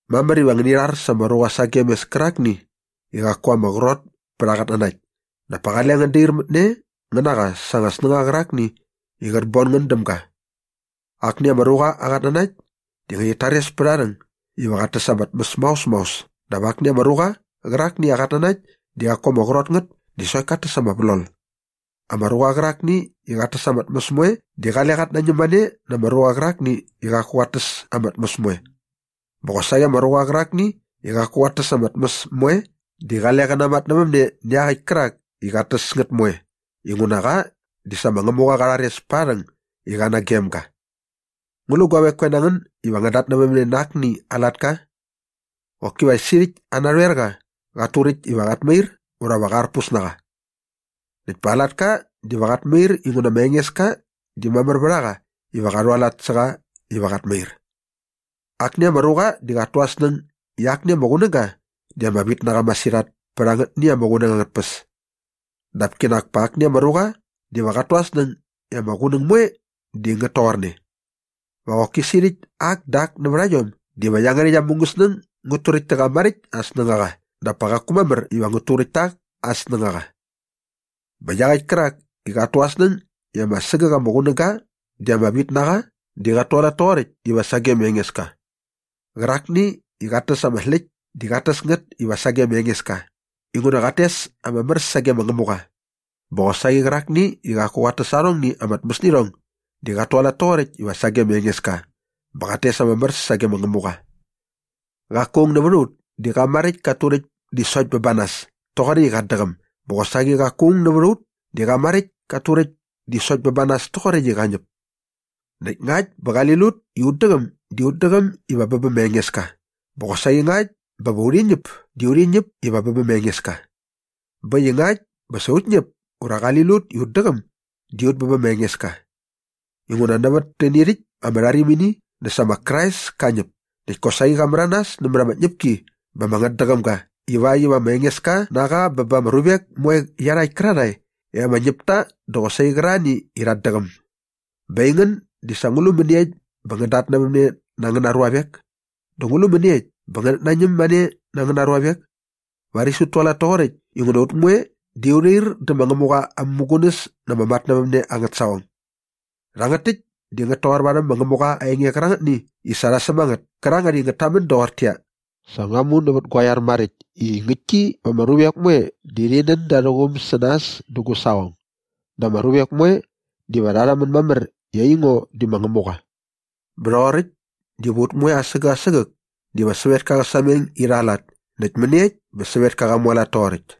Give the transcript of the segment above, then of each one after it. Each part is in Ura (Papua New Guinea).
Mamär iva ngäni rhar sa ama ruqa sagem mes kärakni i qaku ama qrot pät aa qatnanakt dap pa qale ngän dair mät ne ngän na qa sa anga snängaqa qärakni i qät bon ngän däm ga. Akni ama ruqa aa qatnanakt di ngärhit tares pät aa rhäng iva qat täs ama tmäs maos maos dap akni ama ruqa qärakni i aa qatnanakt di qaku ama qrot ngät di sokt kat täs ama vlol. Ama ruqa qärakni i qat täs ama tmäs moe di qale qat nañäm mane na ama ruqa qärakni i qaku qat täs ama tmäs moe. Bä qosaqi ama ruqa qärakni i qaku qat täs ama tmäs moe di qale qä namatnävämne nä iaqäkt kärak i qat täs ngät moe inguna qa di sa ma Ngämuqa qa rhares pät aa rhäng i qa nagem ga. Ngu lu guavek koe na ngän iva ngän datnävämne na akni aa latka? Qoki va sirhäkt aa narhoerqa qat turäkt iva qat mair ura va qa arpus na qa. Näkt pa qa latka diva qat mair inguna ma Engeska di mamär vät a qa iva qa rhualat sä qa iva qat mair. Akni ama ruqa di qat tu aa snäng i akni ama qunäga di ama vit na qa masirhat pät angätni ama qunäng angät tpäs. Dap kinak pa akni ama ruqa diva qat tu aa snäng i ama qunäng moe di ngät toqorne. Va qoki sirhäkt ak dä ak nävät a iom diva iangärhäkt aa mungäsnäng ngät turäkt tä qa maräkt aa snängaqa dap pa qaku mamär iva ngät turäkt ta ak aa snängaqa. Bä iaqäkt kärak i qat tu aa snäng i ama sägäk ama qunäga di ama vit na qa di qat tualat toqoräkt iva sage ma Engeska. Qärakni i qat täs ama släkt di qat täs ngät iva sage ma Engeska inguna qat tes ama mär sage ma Ngämuqa. Bä qosaqi qärakni i qaku qat täs arhongni ama tmäsirhong di qat tualat toqoräkt iva sage ma Engeska bä qat tes ama mär sage ma Ngämuqa. Qaku aung nävät a ut di qa maräkt kat turäkt di sokt bä ba nas toqoräkt i qat däqäm bä qosaqi qaku aung nävät a ut di qa maräkt kat turäkt di sokt bä ba nas toqoräkt i qä ñäp. Näkt ngakt bä qali lut i ut däqäm di ut däqäm iva bä bä ma Engeska bä qosaqi ngakt bä va urhi ñäp di urhi ñäp iva bä bä ma Engeska. Bä äkt i ngakt bä sa ut ñäp ura qali lut i ut däqäm di ut bä bä ma Engeska. Inguna nävät täni rhäkt ama rharimini dä sa ma Krais ka ñäp näkt kosaqi qa märanas nämät ama tñäpki bä ama ngätdäqäm ga ivakt iva ma Engeska na qa bä ba ama ruvek moe iarhakt kärarhae i ama ñäp ta dä qosaqi qärarhani i rhat däqäm. Bä aingän di sa ngu lu mäniekt bä ngän datnävämne na angäna ruavek? Dä ngu lu mäniekt bä ngänät nañäm mane na angäna ruavek? Varis ut tualat toqoräkt inguna va ut moe di u rhair dä ma Ngämuqa aa mämugunäs na ama matnävämne angät saqong. Rhangät täkt di ngät toqor varhäm ma Ngämuqa aa enge qärangätni i sa rha säm a ngät kärangät i ngät tamän doqortäqyia, “Sa ngua mu nävät gua iar maräkt i ngäktki va ama ruvek moe di rhi nän da arhä quum sä nas dä gu saqong dä ama ruvek moe diva rha rhamän mamär i aingo di ma Ngämuqa.” Bä rhoqoräkt diva ut moe asägäk asägäk diva sävetka qä sameng irha aa lat näkt mäniekt bä sävetka qa mualat toqoräkt.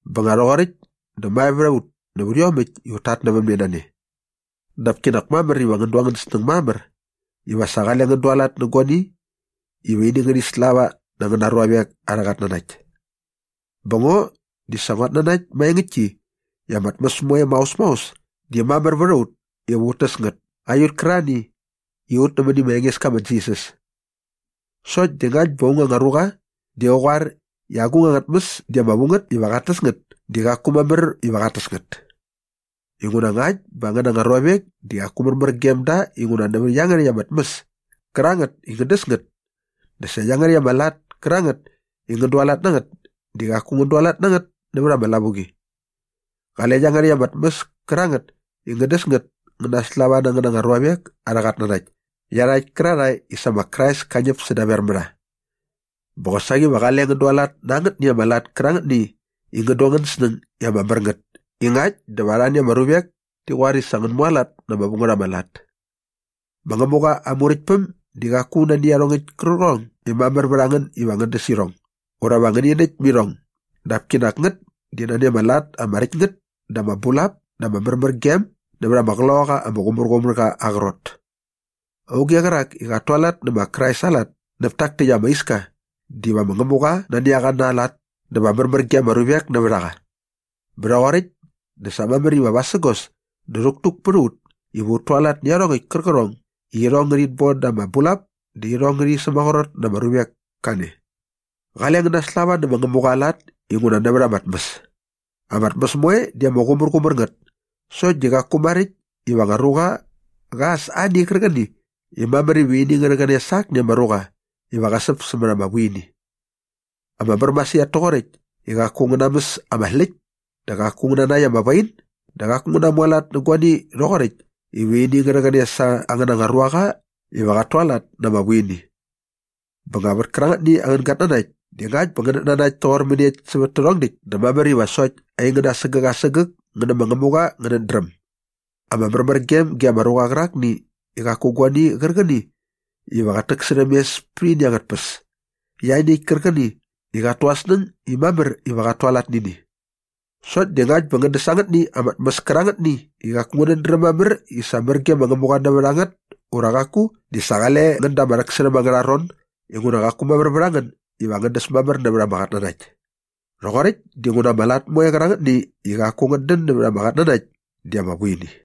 Bä nga rhoqoräkt dä mae vät a ut nävät iomäkt i ut tatnävämne na ne. Dap kinak mamär iva ngän du angän snäng mamär iva sa qale ngän dualat nä guani iva ini ngärhi slava na angäna ruavek arhä qatnanakt. Bä ngo di sa nguat nanakt maengäktki i ama tmäs moe maos maos di mamär vät a ut iva ut täs ngät ut kärarhani i rha nämäni ma Engeska ma Jisas. Sokt di ngakt bä aung anga ruqa di qä qoar i agung anga tmäs di ama vu ngät iva qat täs ngät di qaku mamär iva qat täs ngät. Inguna ngakt bä angäna anga ruavek di qaku märmär gem da inguna nävät iangärhäkt ama tmäs kärangät i ngän däs ngät dä sa iangärhäkt ama lat kärangät i ngän dualat na ngät di qaku ngän dualat na ngät nävät ama lavuqi. Qale iangärhäkt ama tmäs kärangät i ngän däs ngät ngä naslava na angäna ruavek arhä qatnanakt iarhakt kärarhae i sa ma Krais ka ñäp sädaver mä rha. Bä qosaqi va qale ngän dualat na angätni ama lat kärangätni i ngän du angän snäng i ama mär ngät i ngakt dä va arhani ama ruvek ti qoar i sa ngän mualat na ama vu ngät ama lat. Ma Ngämuqa aa Muräktpäm di qaku nani iarhongäkt kärqärhong i mamär vät a ngän iva ngän däs irhong ura va ngäni näkt mä irhong dap kinak ngät di nani ama lat ama räkt ngät dä ama bulap dä ama märmärgem nävät ama Qloqaqa ama Qumärqumärqa aa qrot. Auge qärak i qat tualat nä ma Krais aa lat näp tak täkt ama iska diva ma Ngämuqa nani a qa na aa lat dä va märmär ge ama ruvek nävät a qa. Bä rhoqoräkt dä sa mamär iva vasägos dä rhäktuk pät a ut iva ut tualat nä iarhongäkt kärqärhong i irhong ngärhit bon da ama bulap dä irhong ngärhi sämaqrot na ama ruvek kane. Qale ngän naslava nä ma Ngämuqa aa lat inguna nävät ama tmäs. Ama tmäs moe di ama qumärqumär ngät sokt di qaku maräkt iva ama ruqa qa äs ani qärqäni i mamär iva ini ngä rhäqäne sa akni ama ruqa iva qä säp sämät ama vuini. Ama mär masirhat toqoräkt i qaku ngän namäs ama släkt dä qaku ngän nanäkt ama wain dä qaku ngän namualat nä guani rhoqoräkt iva ini ngä rhäqäne sa angäna ruaqa iva qat tualat na ama vuini. Bä nga vät kärangätni angän gatnanakt di ngakt bä ngänät nanakt toqor mäniekt sävät tärhong däkt dä mamär iva sokt aingän asägäk asägäk ngän nä ma Ngämuqa ngänät dräm. Ama märmärgem ge ama ruqa qärakni i qaku guani qärqäni iva qät täksärhäm mes pät ini angät tpäs ianiäkt kärqäni i qat tu aa snäng i mamär iva qat tualat nä ini. Sokt di ngakt bä ngän däs angätni anga tmäs kärangätni i qaku ngänät dräm mamär i sa mär ge ma Ngämuqa nävät a ngät ura qaku di sa qale ngän da ama rhäksärhäm angärha ron inguna qaku mamär vät a ngän iva ngän däs mamär nävät ama qatnanakt. Rhoqoräkt dinguna ama lat moe kärangätni i qaku ngät dän nävät ama qatnanakt di ama vuini.